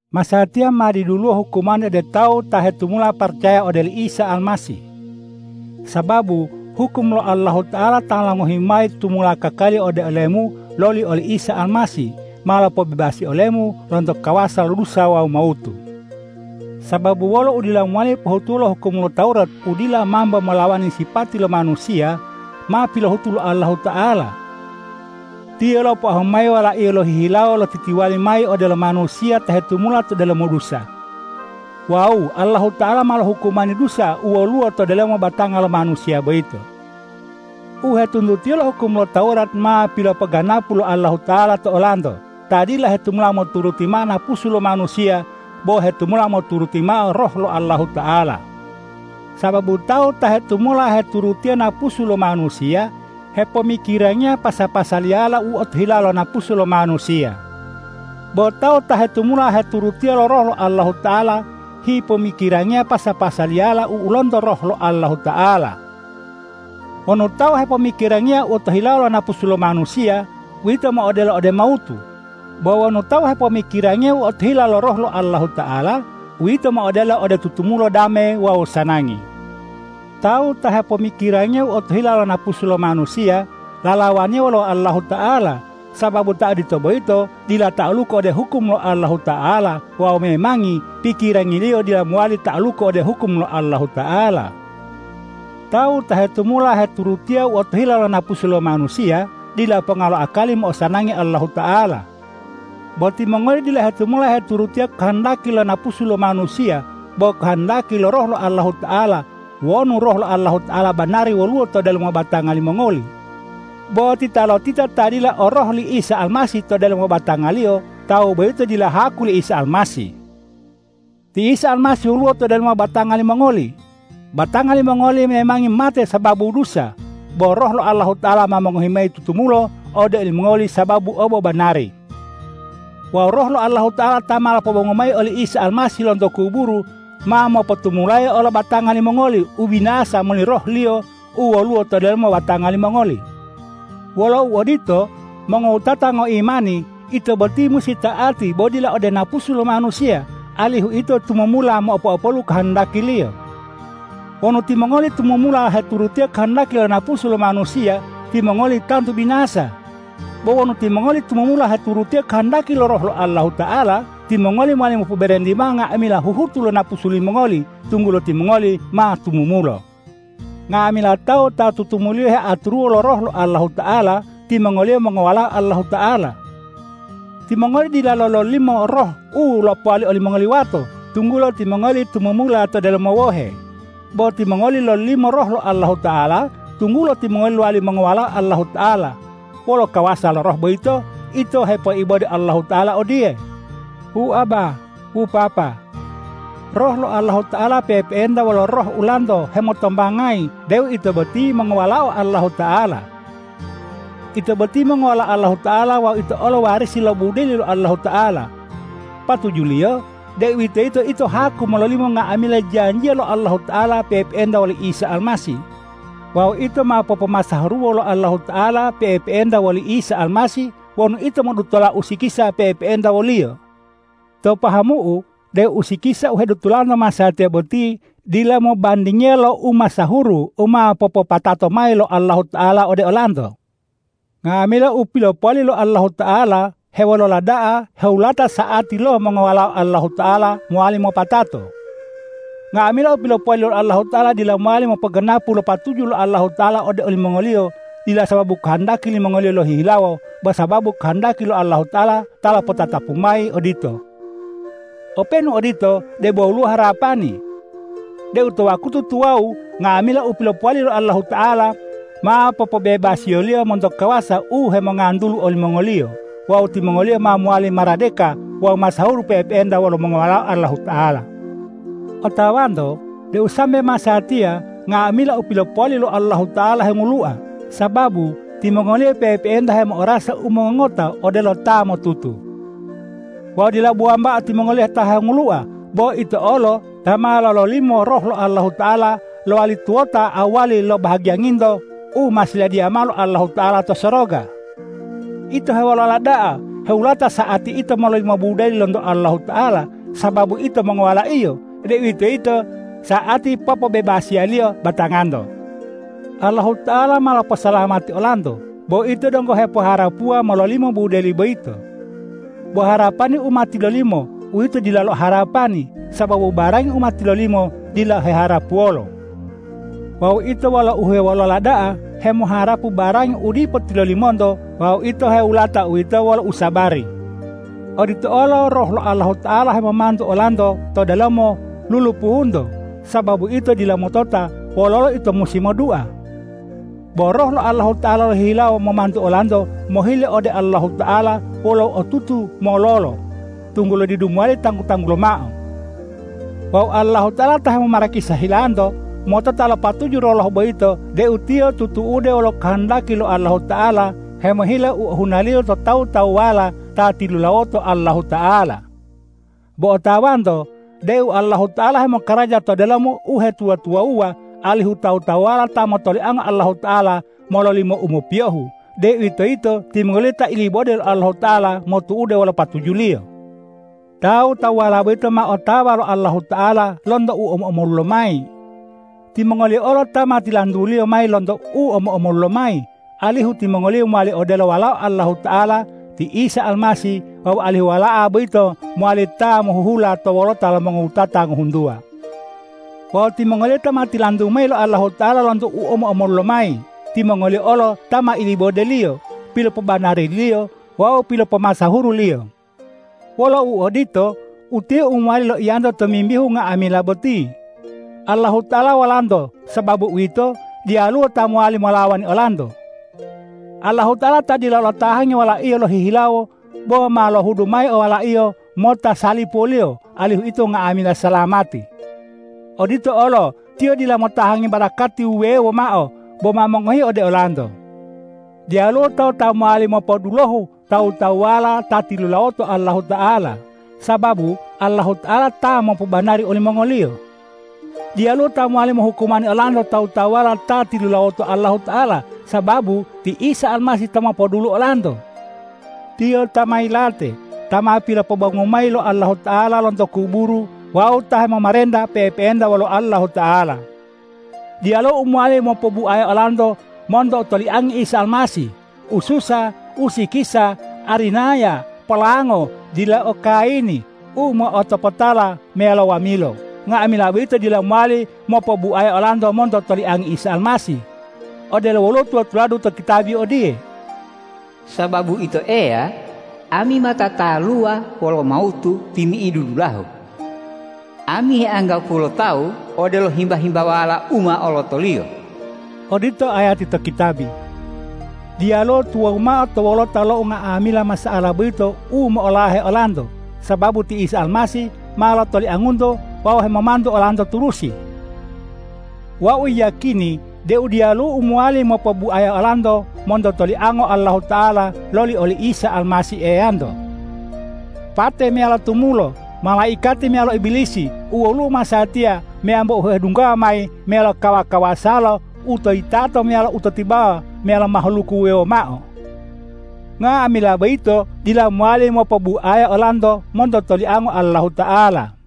Masatiya ma diduluwo hukumani ode tawu ta hetumula paracaya ode oli Isa Almasih. Sababu hukum lo Roh lo Allahuta'ala ta ma longohi mayi tutumula kakali ode olemu loli oli Isa Almasih, ma lopobebasi olemu lonto kawasa lo dusa wawu mawutu. Sababu wolo udila mowali pohutuwo lo hukum lo Tawurat u dila mambo molawani sipati lo manusiya, ma pilohutu lo Allahuta'ala. Tiyo lopoahu mayi Wala-Iyo lohihilawo lotitiwali mayi odelo manusiya ta hetumula to delomo dusa. Wawu Allahuta'ala ma lohukumani dusa u woluwo to delomo batanga lo manusiya boyito. U hetuntutiyo lo hukum lo Tawurat ma pilopoganapu lo Allahuta'ala to olanto ta dila hetumula moturuti mao napusu lo manusiya bo hetumula moturuti mao Roh lo Allahuta'ala. Sababu tawu ta hetumula heturutiya napusu lo manusiya, hepomikirangiya pasa-pasaliyala u otohilawo lo napusu lo manusiya. Bo tawu ta hetumula heturutiya Roh lo Allahuta'ala, hepomikirangiya pasa-pasaliyala u lonto Roh lo Allahuta'ala. Wonu tawu bo hepomikirangiya u otohilawo lo napusu lo manusiya, uwito mo'odelo ode mawutu. Bo wonu tawu hepomikirangiya u otohila lo Roh lo Allahuta'ala, uwito mo'odelo ode tutumula dame wawu sanangi. Tawu ta hepomikirangiya u otohila lo napusu lo manusiya, lalawaniya wolo Allahuta'ala, sababu ta odito boyito dila ta'aluku ode hukum lo Allahuta'ala wawu memangi pikirangiliyo dila mowali ta'aluku ode hukum lo Allahuta'ala. Tawu ta hetumula heturutiya u otohila lo napusu lo manusiya, dila ponga lo akali mo'osanangi Allahuta'ala. Bo timongoli dila hetumula heturutiya kohondaki lo napusu lo manusiya bo kohondaki lo Roh lo Allahuta'ala wonu Roh lo Allahuta'ala banari woluwo to delomo batanga limongoli. Bo titalotita ta dila o Roh li Isa Almasih to delomo batangaliyo, tawu boyito dila haku li Isa Almasih. Ti Isa Almasih woluwo to delomo batanga limongoli. Batanga limongoli memangi mate sababu dusa, bo Roh lo Allahuta'ala ma mongohi mayi tutumulo ode olimongoli sababu obobanari. Wawu Roh lo Allahuta'ala ta ma lopobongu mayi oli Isa Almasih lonto kuburu, ma mopotumulayi olo lo batanga limongoli u binasa moli Roh-Liyo u woluwo to delomo batanga limongoli. Wolo uodito mongowutatango imani, ito boti musi ta'ati bo dila ode napusu lo manusiya, alihu ito tumumula mopo'opolu kohondakiliyo. Wonu timongoli tumumula heturutiya kohondaki lo napusu lo manusiya, timongoli ma tantu binasa. Bo wonu timongoli tumumula heturutiya kohondaki lo Roh lo Allahuta'ala, timongoli mowali mopoberenti mao nga'amila huhutu lo napusu limongoli, tunggulo timongoli ma tumumulo. Nga'amila tawu ta tutumuliyo heaturuwo lo Roh lo Allahuta'ala, timongoliyo mongowalao Allahuta'ala. Timongoli dilalo lololimo roh u lopowali olimongoli wato, tunggulo timongoli tumumula to delomo wohe. Bo timongoli lololimo Roh lo Allahuta'ala, tunggulo timongoli lowali mongowalao Allahuta'ala. Wolo kawasa lo Roh boyito ito hepoibode Allahuta'ala odiye,”Wu Abba, wu Papa!” Roh lo Allahuta'ala pe'epe'enta wolo roh ulanto hemotombangayi deu ito boti mongowalao Allahuta'ala. Ito boti mongowalao Allahuta'ala wawu ito olo warisi lo budeli lo Allahuta'ala. Patujuliyo, deuwitoyito ito o haku mololimo nga'amila janjiya lo Allahuta'ala pe'epe'enta woli Isa Almasih. Wawu ito ma popomasahuruwo lo Allahuta'ala pe'epe'enta woli Isa Almasih wonu ito modutola usikisa pe'epe'enta wo-Liyo. To pahamu'u deu usikisa u hedutolanto masatiya boti dila mobandingiya lo umasahuru u ma popopatato mayi lo Allahuta'ala ode olanto. Nga'amila u pilopowali lo Allahuta'ala hewolola da'a hewulata sa'ati lo mongowalao Allahuta'ala mowali mopatato. Nga'amila u pilopowali lo Allahuta'ala dila mowali mopoganapu lo patuju lo Allahuta'ala ode olimongoliyo dila sababu kohondaki limongoliyo lohihilawo bo sababu kohondaki Allahuta'ala ta lopotatapu mayi odito. Openu odito, debo woluwo harapani deu to wakutu tuwawu nga'amila u pilopowali lo Allahuta'ala, ma popobebasiyo-Liyo monto kawasa u hemongantulu olimongoliyo wawu timongoliyo ma mowali maradeka wawu masahuru pe'epe'enta wolo mongowalao Allahuta'ala. Otawanto deu sambe masatiya nga'amila u pilopowali lo Allahuta'ala hengulua, sababu timongoliyo pe'epe'enta hemo'orasa u mongongoto odelo ta ma motutu. Wawu dila bo wambao timongoliyo ta hengulua, bo ito olo ta ma lololimo Roh lo Allahuta'ala lowali tuwota awali lo bahagiyanginto u ma siladiya mao lo Allahuta'ala to soroga. Ito hewolola da'a hewulata sa'ati ito mololimo budeli lonto Allahuta'ala sababu ito mongowala-Iyo, deuwitoyito sa'ati popobebasiya-Liyo batanganto. Allahuta'ala ma loposalamati olanto, bo ito donggo hepoharapuwa mololimo budeli boyito. Bo harapani u ma tilolimo, uwito dilalo harapani, sababu barangi u ma tilolimo dilalo heharapuwolo. Wawu ito wolo uhewolola da'a hemoharapu barangi u dipo tilolimonto wawu ito hewulata uwito wolo usabari. Odito olo Roh lo Allahuta'ala hemomantu olanto to delomo lulupuhunto, sababu ito dila motota wololo ito musi modua. Bo Roh lo Allahuta'ala lohihilawo momantu olanto mohile ode Allahuta'ala wolo u otutu mololo, tunggulo didu mowali tanggu-tanggulo mao. Wawu Allahuta'ala ta hemomarakisa hilanto, motota lo patuju lo Roh boyito deu Tiyo tutu'ude wolo kohondaki lo Allahuta'ala hemohile u ohunaliyo to tawu-tawuwala ta tilulawoto Allahuta'ala. Bo otawanto deu Allahuta'ala hemokaraja to delomo uhetuwa-tuwawuwa, alihu tawu-tawuwala ta motoliango Allahuta'ala mololimo u mopiyohu, deuwitoyito timongoliyo ta ilibode lo Allahuta'ala motu'ude wolo patuju-Liyo. Tawu-tawuwala boyito ma otawa lo Allahuta'ala lonto u omo-omolu lomayi. Timongoliyo olo ta ma tilantu-Liyo mayi lonto u omo-omolu lomayi, alihu timongoliyo mowali odelo Walao Allahuta'ala ti Isa Almasih wawu alihu Wala'a boyito mowali ta mohuhula to wolota lo mongowutata ngohuntuwa. Wawu timongoliyo ta ma tilantu mayi lo Allahuta'ala lonto u omo-omolulo mayi, timongoliyo olo ta ma ilibode-Liyo, pilopobanari-Liyo wawu pilopomasahuru-Liyo. Wolo uodito, utiye u mowali loiyanto tomimbihu unga'amila boti. Allahuta'ala wolanto. Sababu uwito, diyaluwo ta mowali molawani olanto. Allahuta'ala ta dila lotahangi Wala-Iyo lohihilawo bo ma lohudu mayi Wala-Iyo mota salipuwoliyo alihu ito nga'amila salamati. Odito olo Tiyo dila motahangi barakati wuwewo mao bo ma mongohi ode olanto. Diyaluwo tawu ta mowali mopodulohu tawu-tawuwala ta tilulawoto Allahuta'ala, sababu Allahuta'ala ta mopobanari olimongoliyo. Diyaluwo ta mowali mohukumani olanto tawu-tawuwala ta tilulawoto Allahuta'ala, sababu ti Isa Almasih ta mopodulu olanto. Tiyo ta ma yilate, ta ma pilopobongu mayi lo Allahuta'ala lonto kuburu wawu ta hemomarenta pe'epe'enta wolo Allahuta'ala. Diyaluwo u mowali mopobuaya olanto monto toliangi Isa Almasih: Ususa, usikisa, arinaya, polango, dila o kayini, u mo'otopotala meyalo wamilo. Nga'amila boyito dila mowali mopobuaya olanto monto toliangi Isa Almasih. Odelo woluwo tula-tuladu to kitabi odiye,”Sababu Ito Eya, ami ma tataluwa wolo mawutu timi'idu dulahu. Ami heanggapuwo lo tawu odelo himba-himbawala u ma olotoliyo.” Odito ayati to kitabi. Diyaluwo tuwawu mao to wolota lo nga'amila masa'ala boyito u mo'olahe olanto, sababu ti Isa Almasih ma lotoliangunto wawu hemomantu olanto turusi. Wau yiyakini deu diyaluwo u mowali mopobuaya olanto monto toliango Allahuta'ala loli oli Isa Almasih Eyanto. Pate meyalo tumulo, malaikati meyalo Ibilisi, u woluwo masatiya meyambo u hedunggawa mayi meyalo kawa-kawasalo, u to yitato meyalo u to tibawa meyalo mahaluku wuwewo mao: Nga'amila boyito dila mowali mopobuaya olanto monto toliango Allahuta'ala.